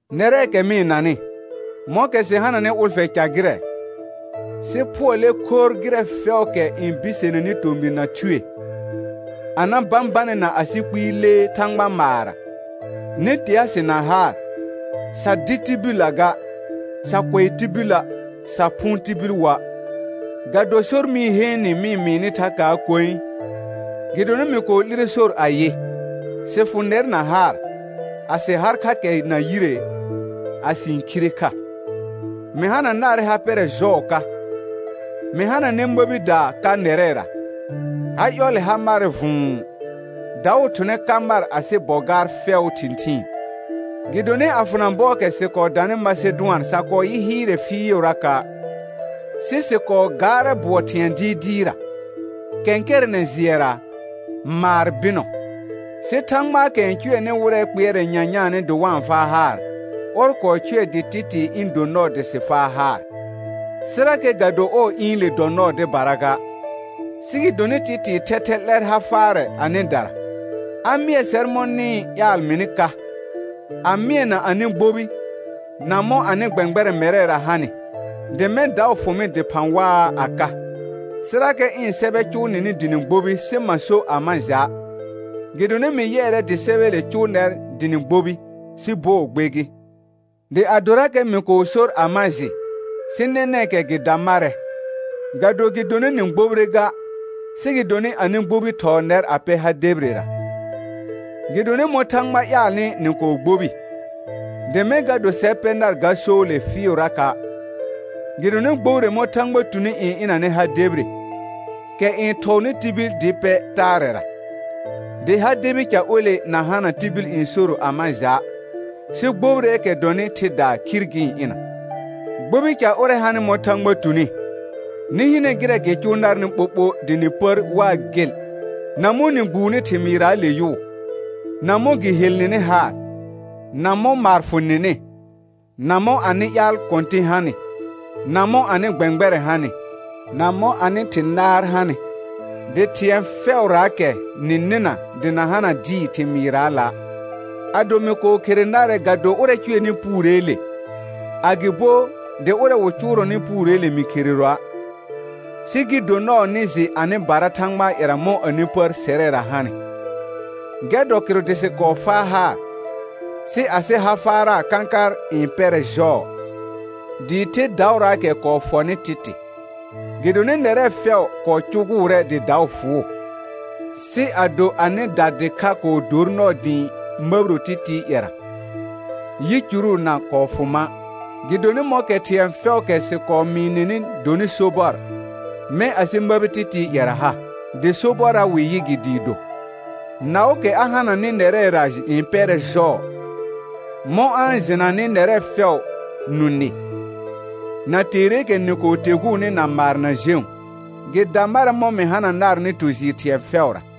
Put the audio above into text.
Nɛrɛɛkɛ mɩ-n nanɩ, mɔ̃kɛ sɩ hananɩ ʋlfɛ ca gɩrɛ, sɩ phʋɔlɛ khorr gɩrɛ fɛʋʋkɛ n biseneni tomɩr na thue, a na bãbanɛ na asɩ kpɩɩ lee Thãgba maarra. Nɩ tea sɩ na haar. Sa dɩ tibillə ga, sa kʋɛ tibilə', sa phʋʋn tibil woa'. Ga do sor mɩ-n heen nɩ mɩ mɩɩnɩ thakaa koe. Gɩdonɩ mɩ kɔɔ 'lire sor ayɩ: Sɩ fʋ nɛr na haar, a sɩ har kha kɛ na yire, a sɩ-n khire kha. Mɩ hana narɛ ha pɛrɛ jɔɔ ka. Mɩ hananɛ məbidaa ka nɛrɛra, ha ƴɔllɛ ha marɛ vʋ̃ʋ, daʋ thʋnɛ ka mar asɩ bɔ gaar fɛʋʋ thɩ̃thɩɩn. Gɩdonɩ a fʋna bɔɔkɛ sɩ kɔɔ danɩ Masedʋan sa kɔɔ yɩ hɩɩrɛ fɩɩʋraka', sɩ sɩ kɔɔ gaarɛ bʋɔ thɩ̃ɛ dɩɩdɩɩra. Kɛ̃kɛrɛnɛ jɩɛra, maar bɩnɔ. Sɩ Thãgbaakɛ n cʋɛnɩ wɩrɛ kpɩɛrɛ nyanyaanɩ dɩ wa-n faa haar, ɔr kɔɔ cʋɛ dɩ Tɩtɩɩ ɩ̃ do nɔɔ dɩ sɩ faa haar. Sɩrakɛ ga do ɔɔ ɩ̃ɩle dɔ nɔɔ dɩbara ga, sɩ gɩdonɩ Tɩtɩɩ thɛthɛ 'lɛr ha faarɛ anɩdara, a mɩɛ sɛr mɔ̃ nɩ-n ƴaal mɩnɩ ka, a mɩɛna anɩ gbobi, na mɔ̃ anɩ gbɛ̃gbɛrɛ̃ mɛrɛra hanɩ, dɩ mɛ̃ daʋ fʋ mɩ dɩphã waa a ka. Sɩrakɛ ɩ̃ sɛbɛ cʋʋ nɩnɩ dɩ nɩ gbobi sɩ ma so a ma ja', gɩdonɩ mɩ yɩɛrɛ dɩ sɛbɛɛle cʋʋ nɛr dɩ nɩ gbobi, sɩ bɔɔ gbe gɩ. Dɩ adorakɛ mɩ kɔɔ sor a ma jɩ, sɩ nɛnɛ̃kɛ gɩ da marɛ, ga do gɩdonɩ nɩ gbobire ga, sɩ gɩdonɩ anɩ gbobi thɔɔ nɛr pɛ ha debirera. Gɩdonɩ mɔ̃ Thãgba ƴaalnɩ nɩ kɔɔ gbobi, dɩ mɛ̃ ga do sɛr pɛ nar ga soole fɩɩʋraka'. Gɩdonɩ gbobire mɔ̃ Thãgba tuni n ɩnanɛ ha debire, kɛ n thɔɔnɩ tibil dɩ pɛ taarɛra, dɩ ha debi ca ole na hana tibil n soro a ma ja'; sɩ gbobireekɛ dɔnɩ thɩdaa khir gɩ-n ɩna. Gbobi ca ʋrɛ hanɩ mɔ̃ Thãgba tuni, nɩ hɩnɛ gɩrɛ gɩ cʋʋ narnɩ ɓoɓo dɩ nɩ pər waa gel, na mɔ̃ nɩ gbuuni thɩmɩɩrraale yʋʋ, na mɔ̃ gɩ hel nɩnɩ haar, na mɔ̃ maar fʋ nɩnɩ, na mɔ̃ anɩ ƴaal kɔ̃tɩ̃ hanɩ, na mɔ̃ anɩ gbɛ̃gbɛrɛ̃ hanɩ, na mɔ̃ anɩ thɩ̃ naar hanɩ. Dɩ thɩ̃ɛ fɛʋraakɛ nɩ nɩna dɩ na hana dɩɩ thɩmɩɩrraala'. Ado mɩ kɔɔ khere narɛ ga do ʋrɛ cʋɛnɩ puureele, agɩbo dɩ ʋrɛ wɩ cʋʋrɔnɩ puureele mɩ khereroa', sɩ gɩ do nɔɔ nɩ jɩ anɩbara Thãgbaa ƴɛra mɔ̃ anɩ pər sɛrɛra hanɩ. Gɛr dɔ kɩrʋ dɩ sɩ kɔɔ faa haar; sɩ asɩ ha faara kãkar n pɛrɛ jɔɔ, dɩɩ the daʋraakɛ kɔɔ fɔnɩ Tɩtɩ, gɩdonɩ nɛrɛ fɛʋ kɔɔ cʋgʋʋrɛ dɩ daʋ fʋʋ. Sɩ ado anɩda dɩkha kɔɔ dor nɔɔ dɩ ɩ̃ məbiro Tɩtɩɩ ƴɛra, ƴicuru na kɔɔ fʋ ma', gɩdonɩ mɔ̃kɛ thɩ̃ɛ fɛʋʋkɛ sɩ kɔɔ mɩɩ nɩnɩ donɩ sobɔr, mɛ̃ asɩ məbi Tɩtɩɩ ƴɛra ha, dɩ sobɔrra wɩ yɩ gɩ dɩɩ do. Naʋʋkɛ a hananɩ nɛrɛra n pɛrɛ jɔɔ, mɔ̃ a-n jɩnanɩ nɛrɛ fɛʋʋ nũ nɩ, na teereekɛ nɩ kɔɔ teguuni na maar na jẽu. Gɩ da marɛ mɔ̃ mɩ hana narnɩ tu jɩɩr thɩ̃ɛ fɛʋra.